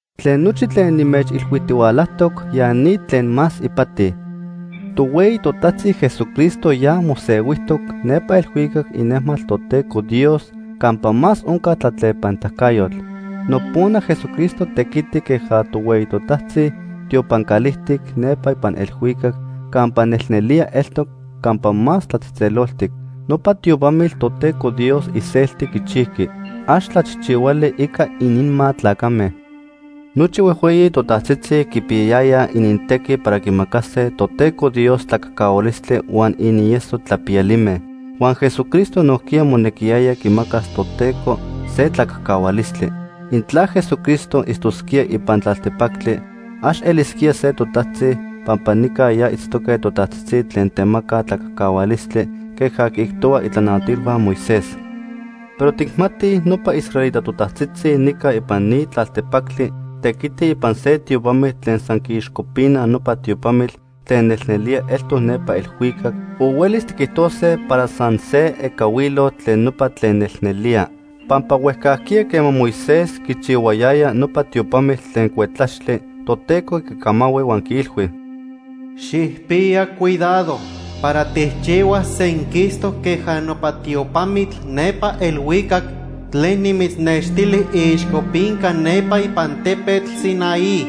Tlen nochi tlen nimechilhuijtihualajtoc, ya ni tlen más ipati: Tohueyi totajtzi Jesucristo ya mosehuijtoc nepa elhuicac inejmatl Toteco Dios campa más onca tlatlepanitacayotl. Nopona Jesucristo tequiti queja tohueyi totajtzi tiopan calijtic nepa ipan elhuicac campa nelnelía eltoc Campa Más Tlatzejtzeloltic. Nopa tiopamitl Toteco Dios iselti quichijqui. Ax tlachijchihuali ica ininma tlacame. Nochi huejhueyi totajtzitzi quipiyayayaj inintequi para quimacase Toteco Dios tlacajcahualistli huan inieso tlapiyalime. Huan Jesucristo nojquiya monequiyaya quimacas Toteco se tlacajcahualistli. Intla Jesucristo itztosquía ipan tlaltepactli, ax elisquía se totajtzi, pampa nica ya itztoque totajtzitzi tlen temacaj tlacajcahualistli queja quiijtohuaj itlanahuatilhua Moisés. Pero tijmatij nopa israelita totajtzitzi nica ipan ni tlaltepactli tequitij ipan se tiopamitl tlen san quiixcopinaj nopa tiopamitl tlen nelnelía eltoc nepa elhuicac, o huelis tiquijtose para san se ecahuilotl tlen nopa tlen nelnelía. Pampa huejcajquiya quema Moisés quichihuayaya nopa tiopamitl tlen cuetlaxtli, Toteco quicamahui huan quiilhui: “Xijpiya cuidado para tijchihuas senquistoc queja nopa tiopamitl nepa elhuicac tlen nimitznextili iixcopinca nepa ipan tepetl Sinaí.”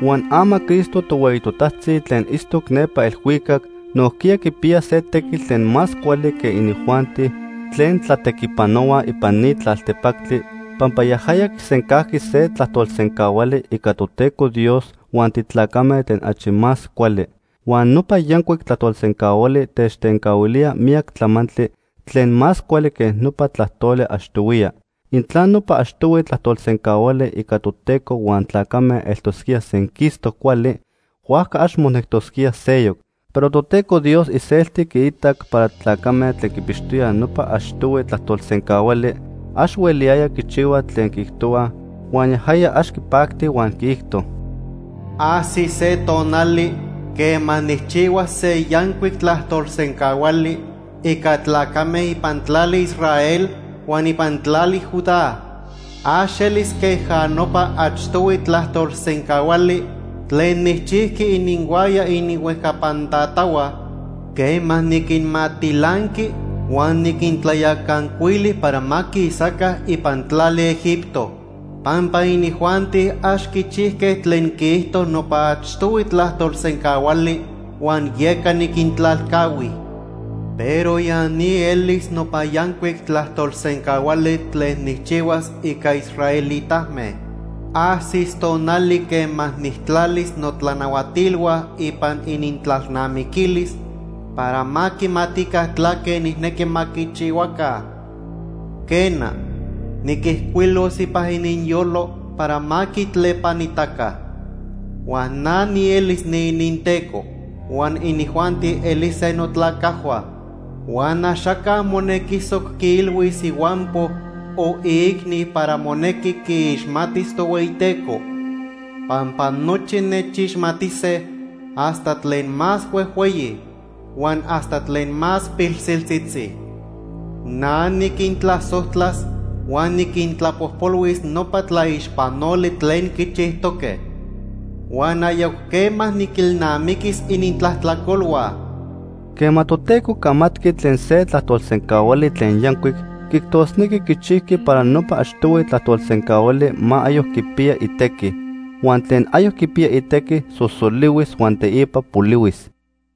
Huan ama Cristo tohueyi totajtzi tlen itztoc nepa elhuicac nojquiya quipiya se tequitl tlen más cuali que inijuanti tlen tlatequipanohuaj ipan ni tlaltepactli, pampa yajaya quisencajqui se tlajtolsencahuali ica Toteco Dios huan titlacame tlen achi más cuali. Huan nopa yancuic tlajtolsencahuali techtencahuilía miyac tlamantli tlen más cuali que nopa tlajtoli achtohuiya. Intla nopa achtohui tlajtolsencahuali ica Toteco huan tlacame eltosquía senquistoc cuali, huajca ax monectosquía seyoc. Pero Toteco Dios iselti quiitac para tlacame tlen quipixtoyaj nopa achtohui tlajtolsencahuali, ax hueliyayaj quichihuaj tlen quiijtohua, huan yajaya ax quipacti huan quiijto: “Ajsis se tonali quema nijchihuas se yancuic tlajtolsencahuali ica tlacame ipan tlali Israel huan ipan tlali Judá. Ax elis queja nopa achtohui tlajtolsencahuali tlen nijchijqui ininhuaya ininhuejcapan tatahua quema niquinmatilanqui huan niquintlayacancuili para ma quisaca ipan tlali Egipto. Pampa inijuanti ax quichijque tlen quiijto nopa achtohui tlajtolsencahuali huan yeca niquintlalcahui. Pero ya ni elis nopa yancuic tlajtolsencahuali tlen nijchihuas ica israelitame. Ajsis tonali quema nijtlalis notlanahuatilhua ipan inintlalnamiquilis para ma quimatica tlaque nijnequi ma quichihuaca. Quena, niquijcuilos ipan ininyolo para ma quitlepanitaca. Huan na nielis niininTeco huan inijuanti elise notlacajhua. Huan axaca monequisoc quiilhuis ihuampo o iicni para monequi quiixmatis Tohueyiteco, pampa nochi nechixmatise hasta tlen más huejhueyi huan hasta tlen más pilsiltzitzi. Na niquintlasojtlas huan niquintlapojpolhuis nopa tlaixpanoli tlen quichijtoque, huan ayoc quema niquilnamiquis inintlajtlacolhua.” Quema Toteco camatqui tlen se tlajtolsencahuali tlen yancuic, quiijtosnequi quichijqui para nopa achtohui tlajtolsencahuali ma ayoc quipiya itequi. Huan tlen ayoc quipiya itequi sosolihuis huan teipa polihuis.